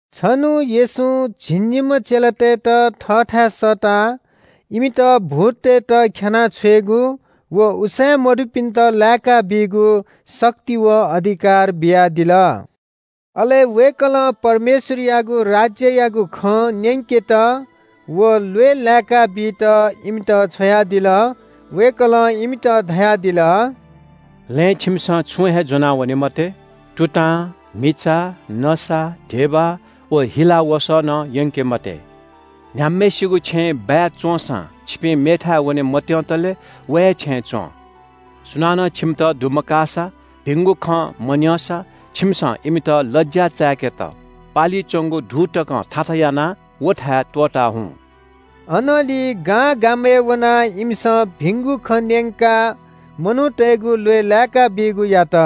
छन्‍हु येशूं झिंनिम्‍ह चेलातय्‌त थःथाय् सःताः इमित भूततय्‌त ख्‍यानाः छ्वयेगु व उसाँय् मदुपिन्‍त लाय्‌काबीगु शक्ति व अधिकार बियादिल। अले वय्‌कलं परमेश्‍वरयागु राज्‍ययागु खँ न्‍यंकेत व ल्‍वय् लाय्‌काबीत इमित छ्वयादिल। वय्‌कलं इमित धयादिल – “लँय् छिमिसं छुं हे ज्‍वनावने मते। तुतां, म्‍हिचा, नसा, धिबा व हिला वसः नं यंके मते। न्‍ह्याम्‍हय्‌सिगु छेँय् बाय् च्‍वंसां छिपिं मेथाय् वने मत्‍यंतले व हे छेँय् च्‍वँ। सुनानं छिमित दुमकाःसा, भिंगु खँ मन्‍यंसा छिमिसं इमित लज्‍या चाय्‌केत पालि च्‍वंगु धू तकं थाथा यानाः व थाय् त्‍वःता हुँ।” अनंलि गांगामय् वनाः इमिसं भिंगु खँ न्‍यंकाः मनूतय्‌गु ल्‍वय् लाय्‌काबीगु यात।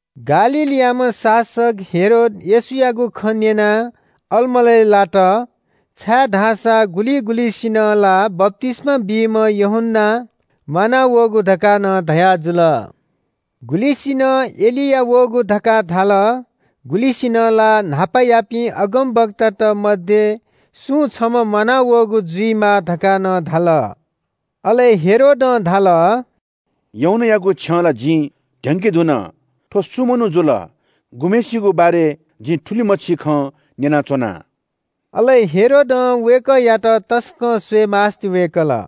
गालीलयाम्‍ह शासक हेरोद येशूयागु खँ न्‍यनाः अलमलय् लात, छाय्‌धाःसा गुलिं गुलिंसिनं ला बप्‍तिस्‍मा बीम्‍ह यूहन्‍ना म्‍वानावःगु धकाः नं धयाजुल। गुलिसिनं एलिया वःगु धकाः धाल। गुलिसिनं ला न्‍हापायापिं अगमवक्तात मध्‍ये सुं छम्‍ह म्‍वानावःगु जुइमाः धकाः नं धाल। अले हेरोदं धाल – “यूहन्‍नायागु छ्यं ला जिं ध्‍यंके धुन। थ्‍व सु मनू जुल, गुम्‍हय्‌सिगु बारे जिं थुलिमछि खँ न्‍यनाच्‍वना?” अले हेरोदं वय्‌कःयात तसकं स्‍वयेमास्‍ति वय्‌कल।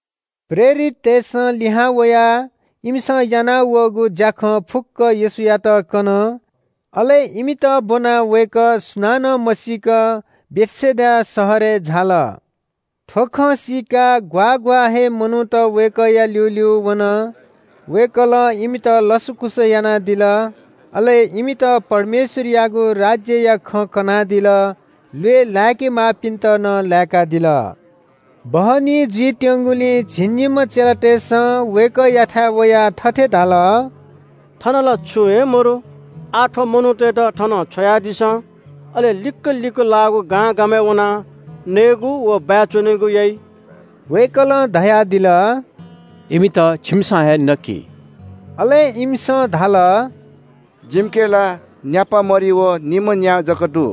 प्रेरिततय्‌सं लिहां वयाः इमिसं यानावःगु ज्‍याखँ फुक्‍क येशूयात कन। अले इमित ब्‍वनाः वय्‌कः सुनानं मसीक बेथसेदा शहरय् झाल। थ्‍व खँ सीकाः ग्‍वाः ग्‍वाः हे मनूत वय्‌कःया ल्‍यूल्‍यू वन। वय्‌कलं इमित लसकुस यानादिल। अले इमित परमेश्‍वरयागु राज्‍यया खँ कनादिल। ल्‍वय् लाय्‌के माःपिन्‍त नं लाय्‌कादिल। बहनी जुइत्‍यंगुलिं झिंनिम्‍ह चेलातय्‌सं वय्‌कःयाथाय् वयाः थथे धाल – “थन ला छुं हे मदु। आः थ्‍व मनूतय्‌त थनं छ्वयादिसँ। अले लिक्‍क लिक्‍क लाःगु गांगामय् वनाः नयेगु व बाय् च्‍वनेगु याइ।” वय्‌कलं धयादिल – “इमित छिमिसं हे नकि।” अले इमिसं धाल – “जिमिके ला न्‍यापा मरि व निम्‍ह न्‍या जक दु।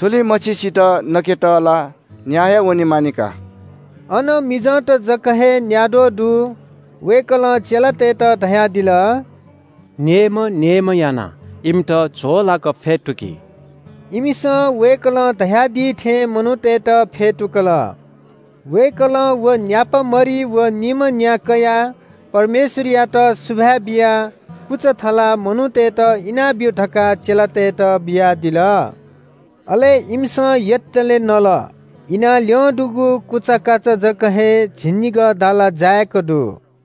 थुलिमछिसित नकेत ला न्‍याः हे वनेमानि का।” अन मिजंत जक हे न्‍याद्वः दु। वय्‌कलं चेलातय्‌त धयादिल – “नेय्‌म्‍ह नेय्‌म्‍ह यानाः इमित झ्‍वःलाक फ्‍यतुकि।” इमिसं वय्‌कलं धयादी थें मनूतय्‌त फ्‍यतुकल। वय्‌कलं व न्‍यापा मरि व निम्‍ह न्‍या कयाः परमेश्‍वरयात सुभाय् बियाः कुचा थलाः मनूतय्‌त इनाब्‍यु धकाः चेलातय्‌त बियादिल। अले इमिसं यतले नल। इनाः ल्‍यं दुगु कुचाकाचा जक हे झिंनिगः दाला जाय्‌क दु।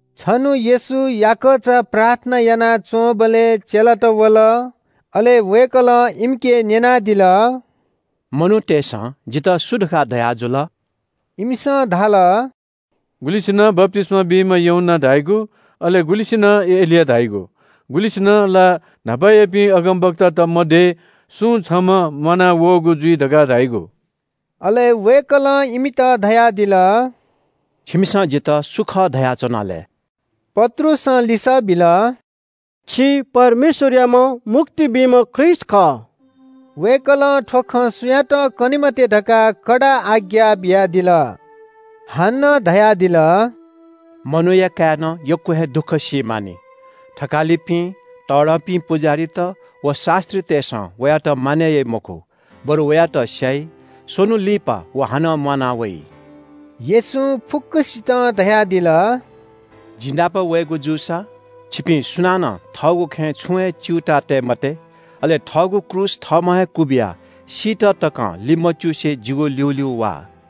छन्‍हु येशू याकःचा प्रार्थना यानाच्‍वंबलय् चेलात वल। अले वय्‌कलं इमिके न्‍यनादिल – “मनूतय्‌सं जितः सु धकाः धयाजुल?” इमिसं धाल – “गुलिसिनं बप्‍तिस्‍मा बीम्‍ह यूहन्‍ना धाइगु, अले गुलिंसिनं एलिया धाइगु, गुलिंसिनं ला न्‍हापायापिं अगमवक्तात मध्‍ये सुं छम्‍ह म्‍वानावःगु जुइ धकाः धाइगु।” अले वय्‌कलं इमित धयादिल – “छिमिसं जितः सु खः धयाच्‍वना लय्?” पत्रुसं लिसः बिल – “छि परमेश्‍वरयाम्‍ह मुक्ति बीम्‍ह ख्रीष्‍ट खः।” वय्‌कलं थ्‍व खँ सुयातं कने मते धकाः कडा आज्ञा बियादिल। हानं धयादिल – “मनूया काय्‌नं यक्‍व हे दुःख सी मानि। थकालिपिं, तःधंपिं पुजाहारीत, व शास्‍त्रीतय्‌सं वयात मानय् याइ मखु, बरु वयात स्‍याइ, स्‍वन्‍हु लिपा व हानं म्‍वाना वइ।” येशूं फुक्‍कसितं धयादिल – “जि नाप वयेगु जूसा छिपिं सुनानं थःगु खँय् छुं हे च्‍यूताः तये मते। अले थःगु क्रूस थःम्‍हं हे क्‍वबिया सीत तकं लिमच्‍युसे जिगु ल्‍यूल्‍यू वा।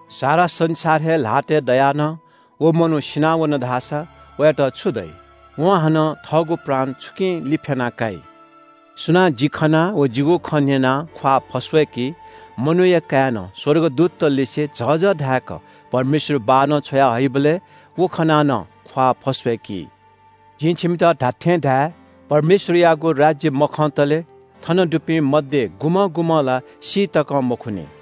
सारा संसार हे ल्‍हातय् दयाः नं व मनू सिनावन धाःसा वयात छु दइ? वं हानं थःगु प्राण छुकिं लिफ्‍याना काइ? सुनां जि खनाः व जिगु खँ न्‍यनाः ख्‍वाः फस्‍वय्‌की मनूया काय्‌नं स्‍वर्गदूततलिसे झःझः धाय्‌क परमेश्‍वर बाःनं छ्वया हइबलय् व खनाः नं ख्‍वाः फस्‍वय्‌की। जिं छिमित धात्‍थें धाये – परमेश्‍वरयागु राज्‍य मखंतले थन दुपिं मध्‍ये गुम्‍हं गुम्‍हं ला सी तकं मखुनि।”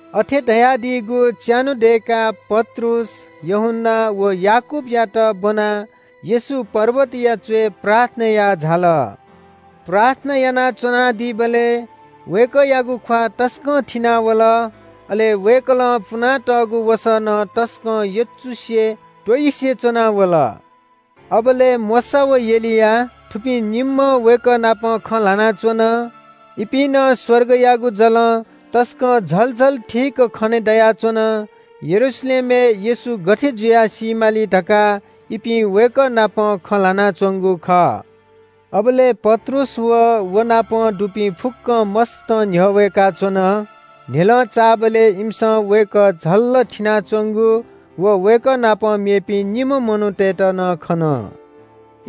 अथे धयादीगु च्‍यान्‍हु दय्‌काः पत्रुस, यूहन्‍ना व याकूबयात ब्‍वनाः येशू पर्वतया च्‍वय् प्रार्थना याः झाल। प्रार्थना यानाच्‍वनादीबलय् वय्‌कःयागु ख्‍वाः तसकं थिनावल, अले वय्‌कलं पुनातःगु वसः नं तसकं यचुसे त्‍वइसे च्‍वना वल। अबलय् मोशा व एलिया, थुपिं निम्‍ह वय्‌कः नाप खँ ल्‍हानाच्‍वन। इपिं नं स्‍वर्गयागु जलं तसकं झल झल थीक खने दयाच्‍वन। यरूशलेमय् येशू गथे जुयाः सी माली धकाः इपिं वय्‌कः नाप खँ ल्‍हानाच्‍वंगु खः। अबलय् पत्रुस व व नाप दुपिं फुक्‍कं मस्‍तं न्‍ह्यः वय्‌काच्‍वन। न्‍ह्यलं चाःबलय् इमिसं वय्‌कः झल्‍ल थिनाच्‍वंगु व वय्‌कः नाप मेपिं निम्‍ह मनूतय्‌त नं खन।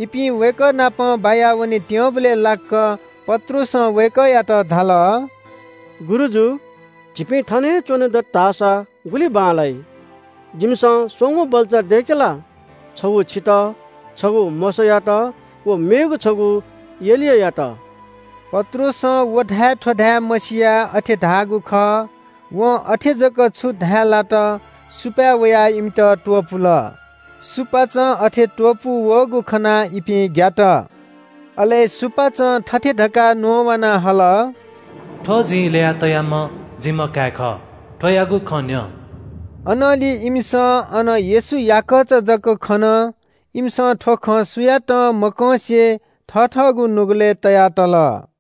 इपिं वय्‌कः नाप बाया वनेत्‍यंबलय् लाक्‍क पत्रुसं वय्‌कःयात धाल – “गुरुजु, झीपिं थन हे च्‍वने दत धाःसा गुलि बांलाइ। जिमिसं स्‍वंगू बल्‍चा दय्‌के ला? छगू छितः, छगू मोशायात व मेगु छगू एलियायात।” पत्रुसं व धाये थ्‍व धाये मसियाः अथे धाःगु खः। वं अथे जक छु धाये लात सुपाँय् वयाः इमित त्‍वपुल। सुपाँचं अथे त्‍वपू वःगु खनाः इपिं ग्‍यात। अले सुपाँचं थथे धकाः न्‍ववाना हल – “थ्‍व जिं ल्‍यया तयाम्‍ह जिम्‍ह काय् खः, थ्‍वयागु खँ न्‍यँ।” अनंलि इमिसं अन येशू याकःचा जक खन। इमिसं थ्‍व खँ सुयातं मकंसे थथःगु नुगलय् तया तल।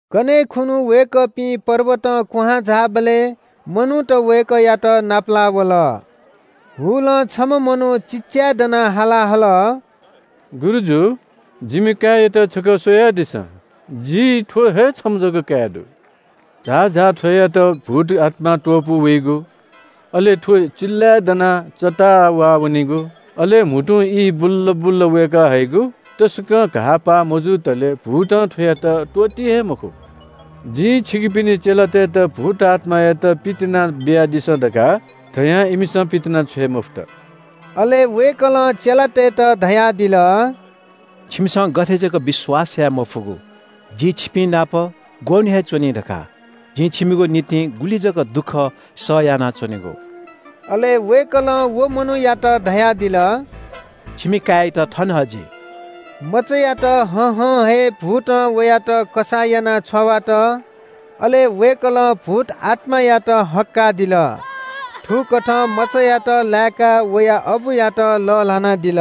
कन्‍हय् खुन्‍हु वय्‌कःपिं पर्वतं क्‍वहां झाःबलय् मनूत वय्‌कःयात नापलाः वल। हुलं छम्‍ह मनू चिल्‍लाय्‌दनाः हाला हल – “गुरुजु, जिमि काय्‌यात छकः स्‍वयादिसँ। जि थ्‍व हे छम्‍ह जक काय् दु। झाःझाः थ्‍वयात भूतआत्‍मां त्‍वपू वइगु, अले थ्‍व चिल्‍लाय् दनाः चत्ताः वाःवनिगु। अले म्‍हुतुं ई बुल्‍ल बुल्‍ल वय्‌काहइगु। तसकं घाःपाः मजुतले भूतं थ्‍वयात त्‍वःती हे मखु। जिं छिकपिनि चेलातय्‌त भूतआत्‍मायात पितिना बियादिसँ धकाः धयां इमिसं पितिनाछ्वये मफुत।” अले वय्‌कलं चेलातय्‌त धयादिल – “छिमिसं गथे जक विश्‍वास याये मफुगु? जि छिपिंनाप ग्‍वःन्‍हु हे च्‍वनी धकाः? जिं छिमिगु निंतिं गुलि जक दुःख सह यानाच्‍वनेगु?” अले वय्‌कलं व मनूयात धयादिल। “छिमि काय्‌यात थन हजि।” मचायात हहं हे भूतं वयात कसाः यानाः छ्वावात। अले वय्‌कलं भूतआत्‍मायात हक्‍कादिल। थुकथं मचायात लाय्‌काः वया अबुयात लःल्‍हानादिल।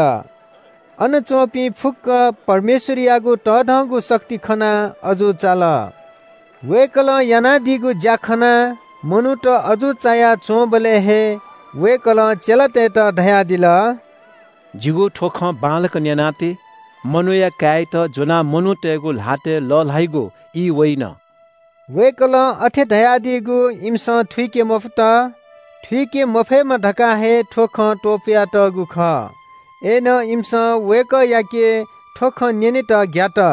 अन च्‍वंपिं फुक्‍क परमेश्‍वरयागु तःधंगु शक्ति खनाः अजू चाल। वय्‌कलं यानादीगु ज्‍या खनाः मनूत अजू चाया च्‍वंबलय् हे वय्‌कलं चेलातय्‌त धयादिल – “जिगु थ्‍व खँ बांलाक न्‍यना ति। मनूया काय्‌यात ज्‍वनाः मनूतय्‌गु ल्‍हातय् लःल्‍हाइगु ई वइन।” वय्‌कलं अथे धयादीगु इमिसं थुइके मफुत। थुइके मफयेमा धकाः हे थ्‍व खँ त्‍वपुयातःगु खः। अय्‌नं इमिसं वय्‌कःयाके थ्‍व खँ न्‍यनेत ग्‍यात।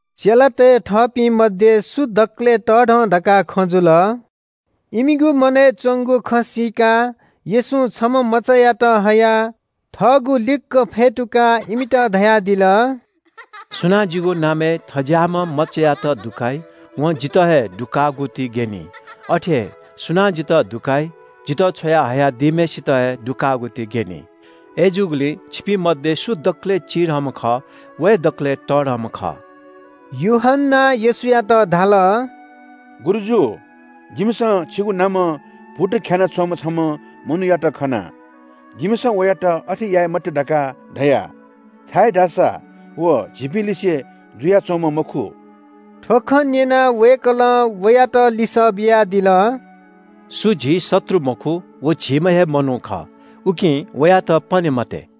चेलातय् थःपिं मध्‍ये सु दकलय् तःधं धकाः खँ जुल। इमिगु मनय् च्‍वंगु खँ सीकाः येशूं छम्‍ह मचायात हयाः थःगु लिक्‍क फ्‍यतुकाः इमित धयादिल – “सुनां जिगु नामय् थज्‍याःम्‍ह मचायात दुकाइ, वं जितः हे दुकाःगु ति ग्‍यनी। अथे हे सुनां जितः दुकाइ, जितः छ्वया हयादीम्‍हय्‌सित हे दुकाःगु ति ग्‍यनी। अय्‌जूगुलिं छिपिं मध्‍ये सु दकलय् चिधंम्‍ह खः, व हे दकलय् तःधंम्‍ह खः।” यूहन्‍नां येशूयात धाल – “गुरुजु, जिमिसं छिगु नामं भूत ख्‍यानाः च्‍वंम्‍ह छम्‍ह मनूयात खना। जिमिसं वयात अथे याये मते धकाः धया, छाय्‌धाःसा व झीपिंलिसे जुयाच्‍वंम्‍ह मखु।” थ्‍व खँ न्‍यनाः वय्‌कलं वयात लिसः बियादिल – “सु झी शत्रु मखु व झीम्‍ह हे मनू खः, उकिं वयात पने मते।”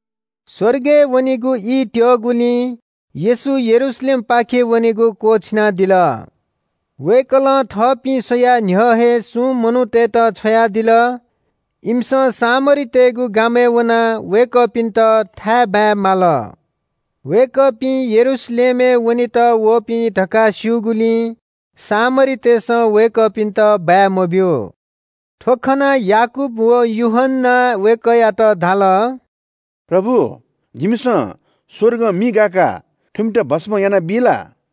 स्‍वर्गय् वनेगु ई त्‍यःगुलिं येशू यरूशलेमपाखे वनेगु क्‍वःछिनादिल। वय्‌कलं थःपिं स्‍वयाः न्‍ह्यः हे सुं मनूतय्‌त छ्वयादिल। इमिसं सामरीतय्‌गु गामय् वनाः वय्‌कःपिन्‍त थाय्‌बाय् माल। वय्‌कःपिं यरूशलेमय् वनेत वःपिं धकाः स्‍यूगुलिं सामरीतय्‌सं वय्‌कःपिन्‍त बाय् मब्‍यू। थ्‍व खनाः याकूब व यूहन्‍नां वय्‌कःयात धाल – “प्रभु, जिमिसं स्‍वर्गं मि गाय्‌काः थुमित भस्‍म यानाबी ला?”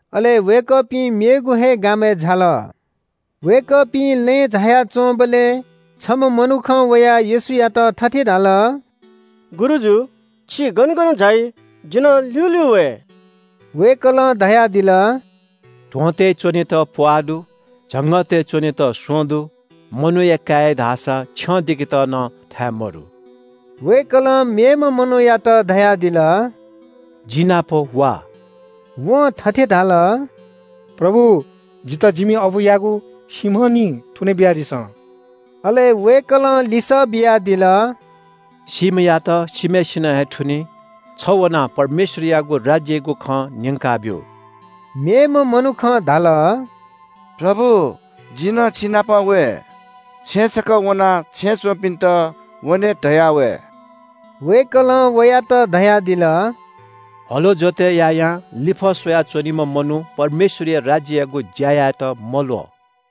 अले वय्‌कःपिं मेगु हे गामय् झाल। वय्‌कःपिं लँय् झाया च्‍वंबलय् छम्‍ह मनुखं वयाः येशूयात थथे धाल – “गुरुजु, छि गन गन झाइ, जि नं ल्‍यूल्‍यू वये।” वय्‌कलं धयादिल – “ध्‍वंतय् च्‍वनेत प्‍वाः दु, झंगःतय् च्‍वनेत स्‍वँ दु, मनूया काय्‌या धाःसा छ्यं दिकेत नं थाय् मदु।” वय्‌कलं मेम्‍ह मनूयात धयादिल – “जि नाप वा।” वं थथे धाल – “प्रभु, जितः जिमि अबुयागु सीम्‍ह निं थुने बियादिसँ।” अले वय्‌कलं लिसः बियादिल – “सीम्‍हयात सीम्‍हय्‌सिनं हे थुनी। छ वनाः परमेश्‍वरयागु राज्‍ययागु खँ न्‍यंकाब्‍यु।” मेम्‍ह मनुखं धाल – “प्रभु, जि नं छिनाप वये। छेँय् छकः वनाः छेँय् च्‍वंपिन्‍त ‘वने’ धया वये।” वय्‌कलं वयात धयादिल – “हलो जोतय् यायां लिफः स्‍वया च्‍वनीम्‍ह मनू परमेश्‍वरया राज्‍ययागु ज्‍या यायेत मल्‍वः।”